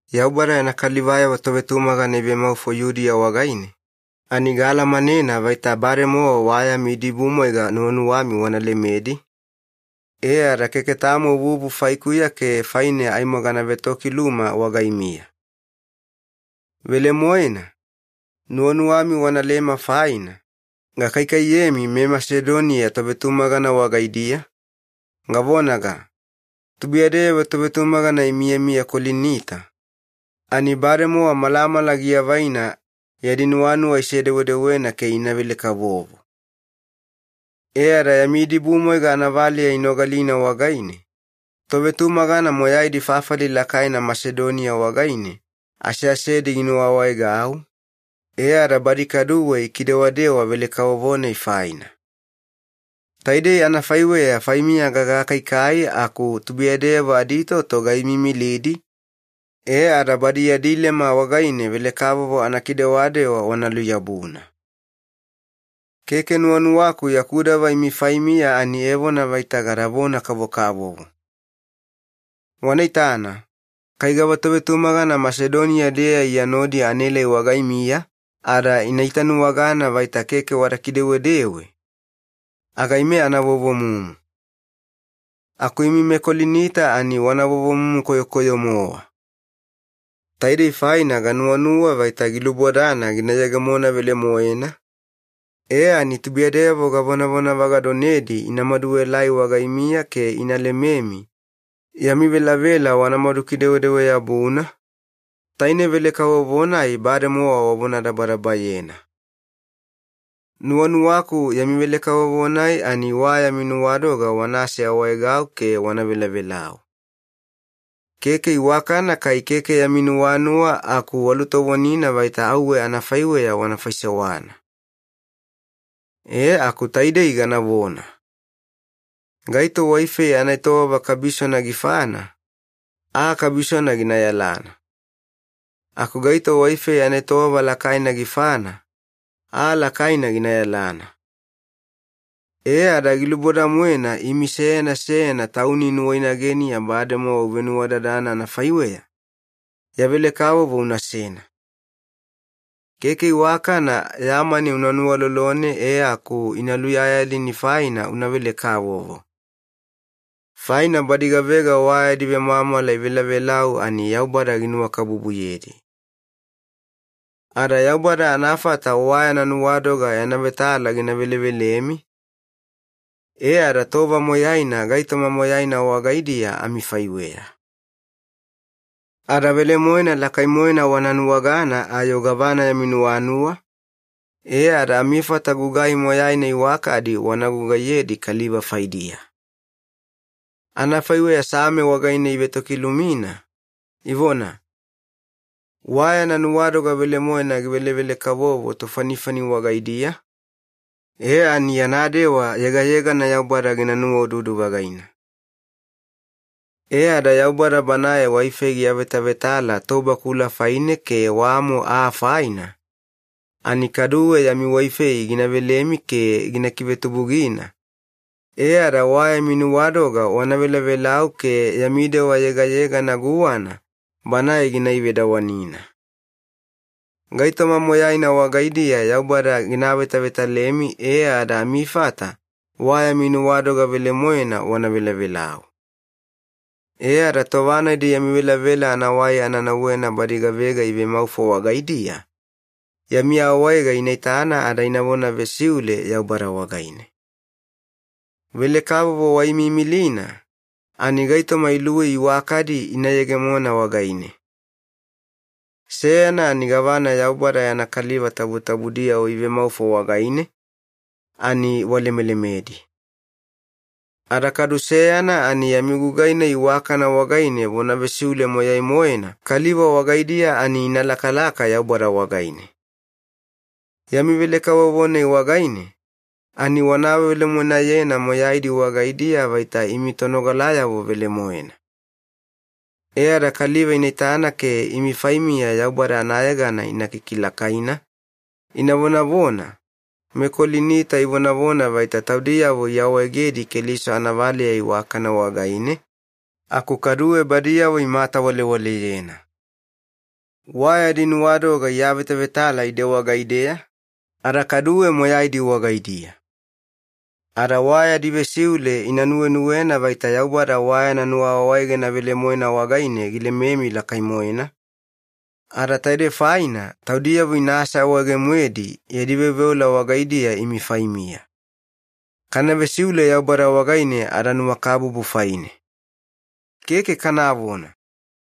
Yaubada yana kalivayavo tovetumagana ivemaufo Yudiya wagaine, ani gaalamanena vaita bademowa wa yami idibumwaiga nuwanuwami wana lemedi, e ada keke tamo vuvu faikuya ke faine aimo gana vetokiluma wagaimiya. Velemoena, nuwanuwami wanalema faina, gakaikaiyemi meMasedonia tovetumagana wagaidiya, gavonaga, “Tubuiyadeyavo tovetumagana imiyamiya Kolinita, ani bademowa malamala giavaina yadi nuwanuwa isedewedewena ke ina velekavovo.” E ada yami idibumwaiga anavaleya inogalina wagaine, tovetumagana moyaidi fafali lakaina Masedoniya wagaine aseasedi ginuwaawaegau, e ada badi kaduwe ikidewadewa velekavovo-nai faina. Taidei anafaiweya faimiya gagakaikai aku tubuiyadeyavo aditoto gaimiimilidi, e ada badi yadi lema wagaine velekavovo anakidewadewa wana luyabuna. Keke nuwanuwaku yaku dava imi faimiya ani evona vaita gadavona-kavokavovo. Wana itana, kai gava tovetumagana Masedoniya-deya Iya nodi anaelai wagaimiya ada ina itanuwagana vaita keke wada kidewedewe, aga ime ana vovomumu. Aku imi meKolinita ani wana vovomumu koyokoyo-mowa. Taidei faina ganuwanuwa vaita gilubodana gina yegemona velemoena, e ani tubuiyadeyavo gavonavagadonedi ina maduaelai wagaimiya ke ina lememi yami velavela wanamadu kidewadewa-yabuna, taine velekavovo-nai bademowa wavonadabadabayena. Nuwanuwaku yami velekavovo-nai ani wa yami nuwadoga wana aseawaegau ke wana velavelau. Keke iwakana kai keke yami nuwanuwa aku walutovonina vaita auwe anafaiweya wana faisewana. E aku taidei ganavona. Gaito waifei anaetowava kabisona gifana, aa kabisona gina yalana. Aku gaito waifei anaetowava lakaina gifana, aa lakaina gina yalana. E ada giluboda-moena imi seyana seyana tauni nuwainageniya bademowa uvenuwadadana anafaiweya, ya velekavovo unasena. Keke iwakana ya mani una nuwalolone e aku ina luyayalini faina una velekavovo. Faina badi gavega wa yadi vemwamwala ivelavelau ani Yaubada ginuwakabubuyedi. Ada Yaubada anafata wa yana nuwadoga yana vetala gina velevelemi, e ada tova moyaina gaitoma moyaina wagaidiya amifaiweya. Ada velemoena lakai-moena wana nuwagana ayo gavana yami nuwanuwa, e ada amifata gugai moyaina iwakadi wana gugaiyedi kaliva faidiya. Anafaiweya Same wagaine ivetokilumina, ivona, “Wa yana nuwadoga velemoena givelevelekavovo tofanifani wagaidiya, e ani yana dewa yegayegana Yaubada gina nuwaududu-vagaina.” E ada Yaubada Banae waifei giavetavetala tobakula faine ke wamo aa faina, ani kaduwe yami waifei gina velemi ke gina kivetubugina, e ada wa yami nuwadoga wana velavelau ke yami dewa yegayegana guwana Banae gina ivedawanina. Gaitoma moyaina wagaidiya Yaubada gina avetavetalemi e ada amifata wa yami nuwadoga velemoena wana velavelau. E ada tova-nadi yami velavela anawai ana nauwena badi gavega ivemaufo wagaidiya, yami awaega ina itana ada inavona vesiule Yaubada wagaine. Velekavovo waimiimilina, ani gaitoma iluwei iwakadi ina yegemona wagaine. Seyana ani gavana Yaubada yana kaliva tabutabudiyavo ivemaufo wagaine, ani walemelemedi. Ada kadu seyana ani yami gugai-nai iwakana wagaine vona vesiule moyai-moena kaliva wagaidiya ani ina lakalaka Yaubada wagaine. Yami velekavovo-nai wagaine, ani wana awavelemoenayena moyaidi wagaidiya vaita imi tonogalayavo velemoena. E ada kaliva ina itana ke imi faimiya Yaubada anayegana ina kikilakaina, ina vonavona, “MeKolinita ivonavona vaita taudiyavo iawaegedi Keliso anavaleya iwakana wagaine, aku kaduwe badiyavo imatawalewaleyena. Wa yadi nuwadoga iavetavetala ide wagaideya, ada kaduwe moyaidi wagaidiya.” Ada wa yadi vesiule ina nuwenuwena vaita Yaubada wa yana nuwaawaegena velemoena wagaine gilememi lakai-moena, ada taide faina taudiyavo ina aseawaege-moedi yadi veoveola wagaidiya imi faimiya. Kana vesiule Yaubada wagaine adanuwakabubu faine. Keke kanavona!